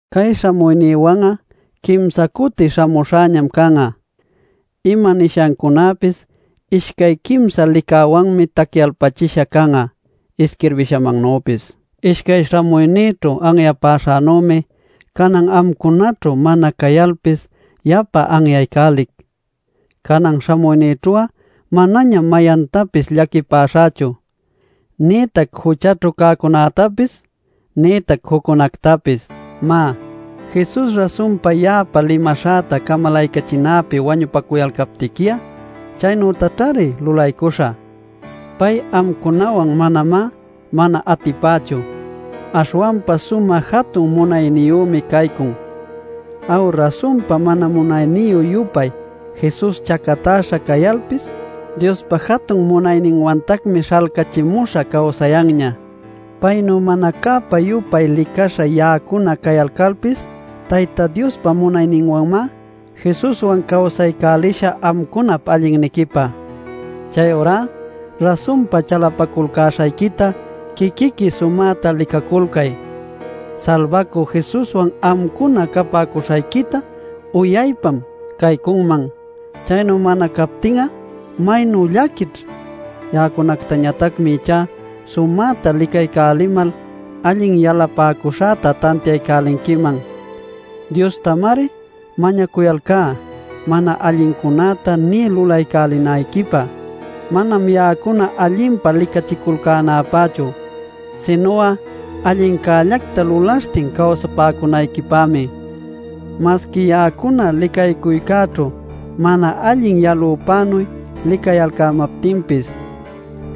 Cay śhamuynïwan'a quimsa cuti śhamuśhäñam can'a. “Ima nishancunäpis ishcay quimsa licäwanmi tacyalpachisha can'a” isquirbishamannüpis. Ishcay śhamuynïćhu anyapäśhänümi, canan amcunaćhu mana cayalpis yapa anyaycälic: Canan śhamuynïćhu'a manañam mayantapis llaquipäśhächu, nïtac juchaćhu cäcunätapis, nïtac juccunätapis. Má, Jesus rasun ya'apä limaśhanta camalaycachinäpi wañupacuyalcaptiqui'a chaynütamari lulaycuśhä; pay amcunawan manamá mana atipächu, aśhwanpa sumä jatun munayniyümi caycun. Aw, rasunpa mana munayniyü-yupay Jesus chacatäśha cayalpis Diospa jatun munayninwanñatacmi śhalcächimuśha cawsayanña. Paynuy mana cäpa-yupay licaśha ya'acuna cayalcalpis Tayta Diospa munayninwanmá Jesuswan cawsaycälishä amcunap allinniquipä. Chayurá rasunpa chalapaculcäśhayquita quiquiqui sumäta licaculcay. Salbacü Jesuswan amcuna capäcuśhayquita uyaypam caycunman. Chaynu mana captin'a ¡maynu llaquićh! Ya'acunactañatacmi ichá sumäta licaycälimal allin yalapäcuśhäta tantiaycälinquiman. Diostamari mañacuyalcá mana allincunäta nï lulaycälinayquipä. Manam ya'acuna allinpa licachiculcänapächu, sinu'a allincällacta lulaśhtin cawsapäcunayquipämi masqui ya'acuna licaycuycäćhu mana allin yalüpänuy licayalcämaptinpis.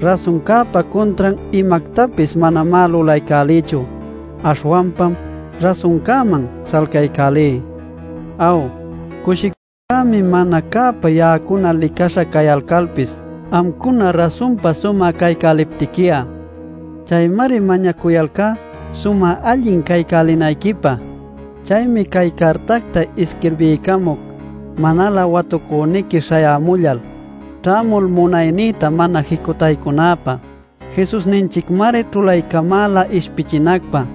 Rasuncäpa cuntran imactapis manamá lulaycälïchu, aśhwanpam rasuncäman śhalcaycälí. Aw, cushiculcämi mana cäpä ya'acuna licaśha cayalcalpis, amcuna rasunpa sumä caycäliptiqui'a. Chaymari mañacuyalcá sumä allin caycälinayquipä. Chaymi cay cartacta isquirbiycamuc manalä watucüniqui śhayämullal, ćhämul munaynïta mana jicutaycunäpä. Jesusninchicmari ćhulaycamäla ishpichinacpä,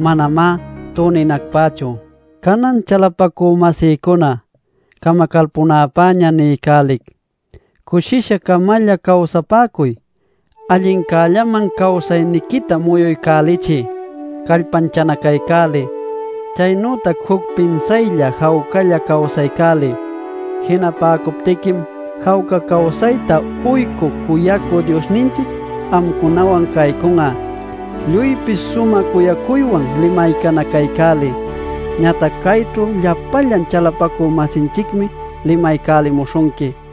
manamá tuninacpächu. Canan chalapacü-masïcuna camacalpunäpäña niycälic: cushisha-camalla cawsapäcuy; allincällaman cawsayniquita muyuycälichiy; callpanchanacaycäliy; chaynütac juc pinsaylla jawcalla cawsaycäliy. Jinapäcuptiquim jawca cawsayta uycü cuyacü Diosninchic amcunawan caycun'a. Lluypis sumä cuyacuywan limaycanacaycäliy. Ñatac cayćhu llapallan chalapacü-masinchicmi limaycälimuśhunqui.